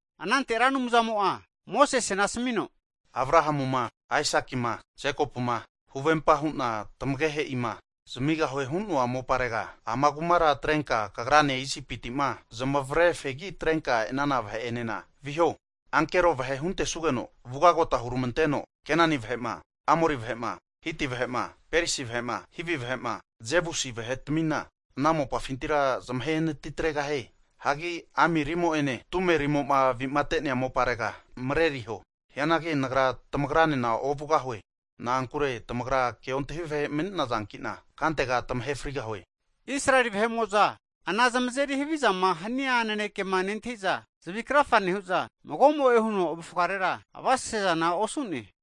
Anante Ra Anumzamo'a Mosesena asamino, Abrahamuma, Aisakima, Jekopuma huvempa hu'na tamagehe'ima zamigahue hu'noa moparega, ama kumara atrenka kagrane Isipiti'ma zamavare fegi atrenka e'nana vahe'enena viho. Ankero vahe huntesugeno vugota huramanteno Kenani vahe'ma, Amori vahe'ma, Hiti vahe'ma, Perisi vahe'ma, Hivi vahe'ma, Jebusi vahetamina ana mopafintira zamahe natitregahie. Hagi amirimo'ene tumerimo'ma avi'mate'nea moparega mareriho. Hianagi Nagra tamagranena ovugahue. Na'ankure tamagra ke ontahi vahe mani'nazanki'na kantega tamahe frigahue. Israeli vahe'mo'za ana zamazeri havizama hania nanekema nentahi'za zavi krafa nehu'za mago'mo'e huno avufgarera avasesezana osu'ne.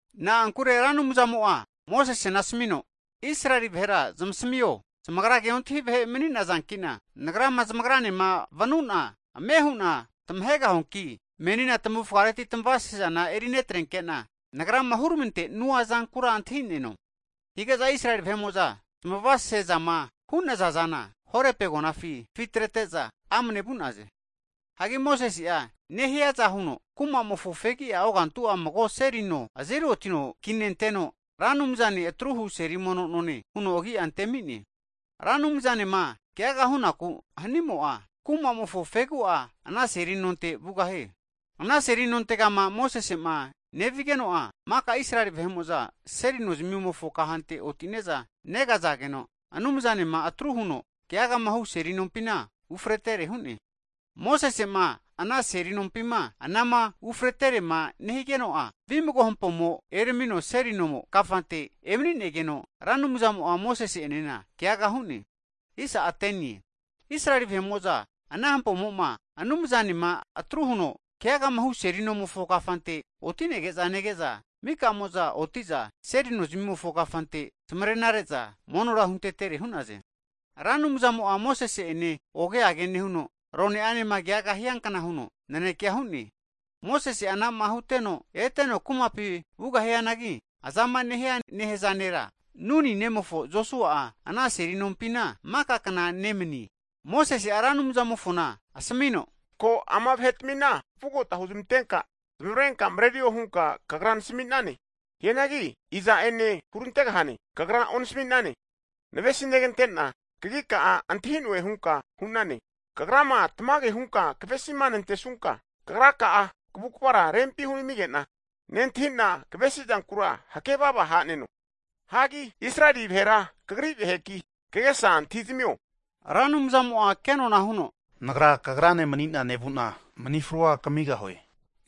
Na'ankure Ra Anumzamo'a Mosesena asamino, Israeli vahera zamasamio, zamagra ke ontahi vahe mani'nazanki'na Nagrama zamgranema vanu'na ame hu'na tamahegahuanki menina tamavufgareti tamavasese zana erinetrenke'na Nagrama huramante'nua zankura antahi'neno. Hige'za Israeli vahe'mo'za zmavasesezama hu'naza zana, Horepi agonafi zafitrete'za amane vu'naze. Hagi Mosese'a nehiaza huno kuma'mofo fegia ogantu mago seli no azeri otino kinenteno, Ra Anumzane atruhu seli mono none huno agia antemi'ne. Ra Anumzanema keaga hunaku hanimo'a, kumamofo fegi'a ana seli nonte vugahie. Ana seli nontegama Mosese'ma nevigeno'a, mika Israeli vahe'mo'za seli nozamimofo kahante otine'za negazageno, Anumzanema atru huno keagama hu seli nompina ufretere hu'ne. Mosese'ma ana seli nompima anama ufreterema nehigeno'a vimago hampomo eramino seli no kafante emani'negeno, Ra Anumzamo'a Mosese enena keaga hu'ne. Israeli vahe'mo'za ana hampomo'ma Anumzanema atruhuno keagamahu seli nomofo kafante oti'nege'za nege'za, mika'mo'za oti'za seli nozamimofo kafante zamarena re'za monora huntetere hu'naze. Ra Anumzamo'a Mosese ene oge age nehuno rone'anema keaga hiankna huno nanekea hu'ne. Mosese'a anama huteno eteno kumapi vugahianagi, azama nehia nera, Nuni nemofo Josua'a ana seli nompina maka kna nemanie. Mosese'a Ra Anumzamofona asamino, Ko ama'i vahetamina vugota huzamantenka zmavrenka mrerio hunka Kagra nasami'nane. Hianagi iza'ene hurantegahane, Kagra onasami'nane. Navesinegante'na kagika'a antahi'noe hunka hu'nane. Kagrama tamage hunka kavesima nantesunka, Kagraka'a kavukavara rempi hunamige'na nentahi'na kavesi zankura hakevava haneno. Hagi Israeli vahera Kagri vaheki kagesa antahizamio. Ra Anumzamo'a kenona huno, Nagra kagrane mani'na nevu'na manifrua kamigahue.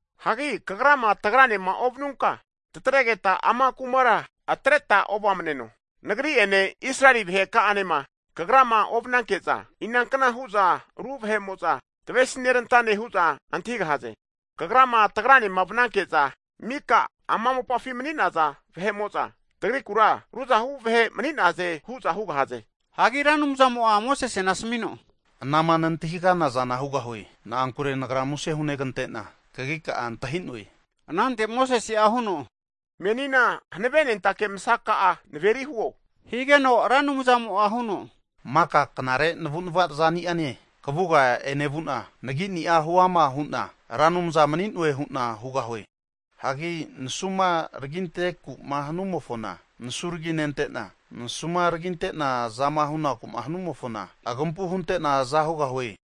Hagi Kagrama, tagranema ovanunka, tatregeta ama kumara atreta ovamneno. Nagri'ene Israeli vahe ka'anema Kagrama ovananke'za, inankna hu'za ru vahe'mo'za tavesinerantane hu'za antahigahaze? Kagrama tagranema vananke'za mika ama mopafima mani'naza vahe'mo'za tagrikura ruzahu vahe mani'naze hu'za hugahaze. Hagi Ra Anumzamo'a Mosesena asamino, Anama nantahigana zana hugahue. Na'ankure Nagra muse hunegante'na kagika'a antahi'noe. Anante Mosese'a huno, Menina hanave nentake masaka'a naveri huo higeno, Ra Anumzamo'a huno, maka knare navu'nava zani'ane kavuga enevu'na, nagini'a huama hu'na Ra Anumza mani'noe hu'na hugahue. Hagi nasuma raginte'naku'ma hanumofona, nasu raginente'na, nasuma raginte'na azama hunaku'ma hanumofona, agampu hunte'na aza hugahue.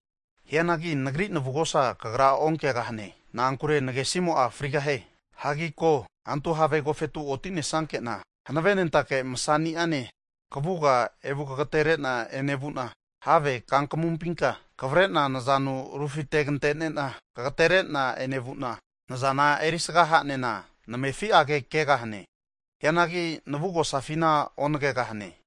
Hianagi Nagri navugosa kagra onkegahane. Na'ankure nagesimo'a frigahie. Hagi ko, antu have agofetu oti'nesanke'na, hanave nentake masani'ane kavuga evu kagatenere'na enevu'na, have kankamunpinka kavre'na nazanu rufitegante'nena kagatere'na enevu'na, nazana erisga ha'nena namefi'age kegahane. Hianagi navugosafina onagegahane.